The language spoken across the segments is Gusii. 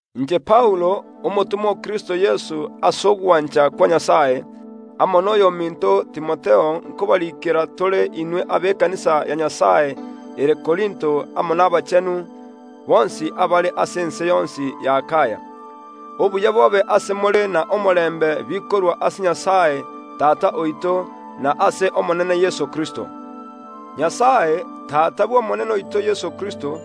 Inche Paulo, omotomwa o Kristo Yeso ase ogwancha kwa Nyasae, amo noyominto Timotheo nkobariikera tore inwe abekanisa ya Nyasae ere ase Korinto amo n’abanto bonsi ba Nyasae abare ase ense yonsi y’Akaya. Obuya bobe ase more na omorembe bikorwa ase Nyasae Tata oito na ase Omonene Yeso Kristo. Nyasae, Tata Omonene oito Yeso Kristo,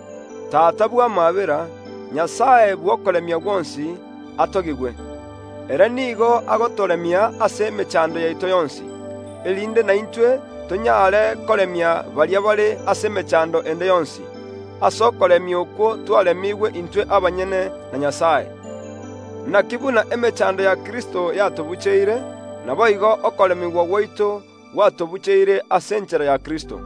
Tata bw’amaabera, Nyasae bw’okoremia gwonsi, atogigwe. Ere nigo agotoremia ase emechando yaito yonsi, erinde naintwe tonyare koremia baria bare ase emechando ende yonsi, ase okoremia okwo twaremigwe intwe abanyene na Nyasae. Naki buna emechando ya Kristo yatobucheire, naboigo okoremigwa gwaito gwatobucheire ase enchera ya Kristo.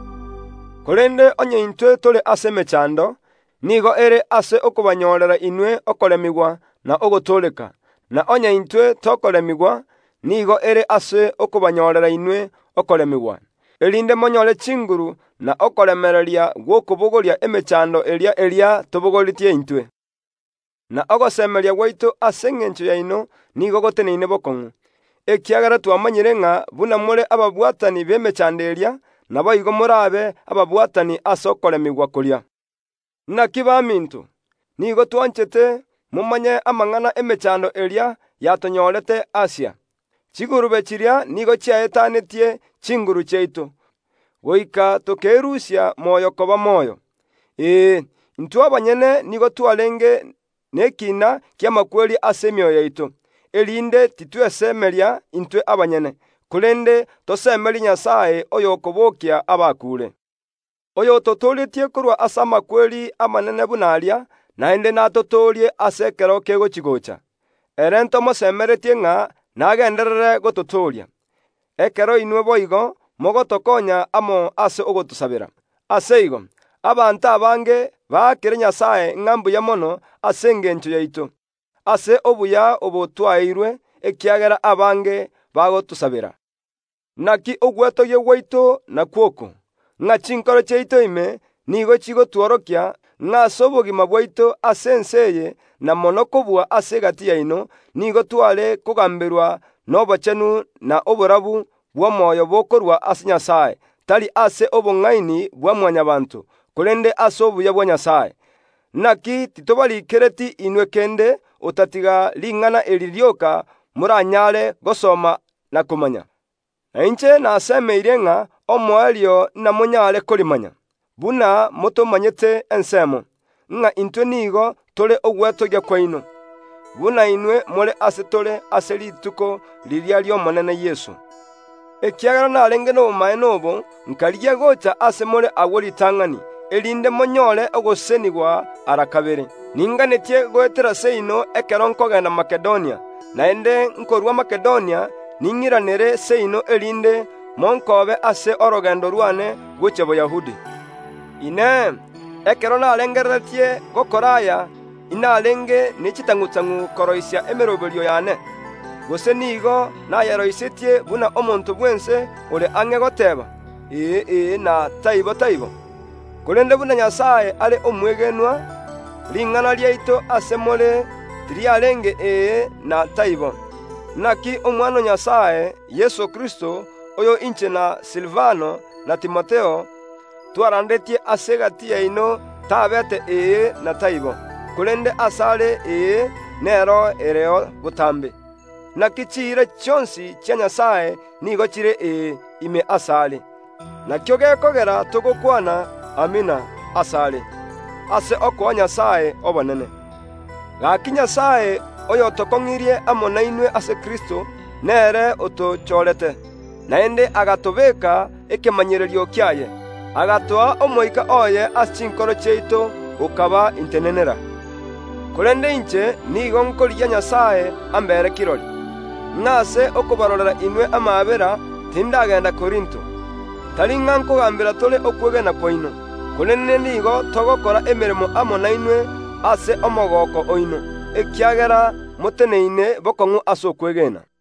Korende onye intwe tore ase emechando, nigo ere ase okobanyorera inwe okoremigwa na ogotooreka, na onye intwe tokoremigwa, nigo ere ase okobanyorera inwe okoremigwa, erinde monyore chinguru na okoremereria gw’okobogoria emechando eria eria tobabogoreretie intwe. Na ogosemeria gwaito ase engencho yaino nigo goteneine bokong’u, ekiagera twamanyire ng’a buna more ababwatani b’emechando eria, naboigo morabe ababwatani ase okoremigwa koria. Naki baminto, nigo twanchete momanye amang’ana ’emechando eria yatonyorete Asia. Chigurube chiria nigo chiaetanetie chinguru chiaito, goika tokerusia moyo koba moyo. Ee, intwe abanyene nigo twarenge nekina ki’amakweri ase emioyo yaito, erinde titwesemeria intwe abanyene, korende tosemerie Nyasae oyokobokia abakuure; oyototooretie korwa ase amakweri amanene buna aria, naende natotoorie ase ekero kegochi‐gocha. Ere ntomosemeretie ng’a nagenderere gototooria, ekero inwe boigo mogotokonya amo ase ogotosabera. Ase igo, abanto abange baakere Nyasae ng’a mbuya mono ase engencho yaito, ase obuya obo twaeirwe, ekiagera abange bagotosabera. Naki ogwetogia gwaito nakwo oko, ng’a chinkoro chiaito ime nigo chigotworokia, ng’a ase obogima bwaito ase ense eye na mono kobua ase egati yaino, nigo tware kogamberwa nobochenu na oborabu bw’omoyo bokorwa ase Nyasae, tari ase obong’aini bwa Mwanyabaanto, korende ase obuya bwa Nyasae. Naki titobarikereti inwe kende, otatiga ring’ana eri rioka moranyare gosoma na komanya. Na inche nasemeirie ng’a omoerio namonyare korimanya, buna motomanyete ensemo, ng’a intwe nigo tore ogwetogia kwaino, buna inwe more ase tore ase rituko riria ri’Omonene Yeso. Ekiagera narenge nobomaene obo nkarigia gocha ase more agwo ritang’ani, erinde monyore ogosesenigwa ara kabere. Ninganetie goetera seino ekero nkogenda Makedonia, naende nkorwa Makedonia ning’iranere seino, erinde monkoobe ase orogendo rwane gochia Boyahudi. Inee! Ekero narengereretie gokora aya, inarenge ne chitang’u‐tang’u koroisia emeroberio yane? Gose nigo nayeroisetie buna omonto bw’ense ore ang’e goteeba, “Ee, ee”, na, “Yaya, Yaya” ase chingaki echimo? Korende buna Nyasae are omwegenwa, ring’ana riaito ase more tiriarenge “Ee” na “Yaya.” Naki Omwana o Nyasae, Yeso Kristo, oyo inche na Silivano, na Timotheo, twarandetie ase egati yaino tabeete “Ee” na “Yaya”, korende asare “Ee” nero ereo botambe. Naki chiira chionsi chia Nyasae nigo chire “Ee” ime asare; nakio gekogera togokwana “Amina” ase Yeso Kristo ase okoa Nyasae obonene. Gaki Nyasae oyotokong’irie amo nainwe ase Kristo; nere otochorete, naende agatobeeka ekemanyererio kiaye, agatoa Omoika oye ase chinkoro chiaito okaba intenenera. Korende inche nigo nkorigia Nyasae ambere kirori, ng’a ase okobarorera inwe amaabera tindagenda Korinto. Tari ng’a nkogambera tore okwegena kwaino; korende nigo togokora emeremo amo nainwe ase omogooko oino, ekiagera moteneine bokong’u ase okwegena.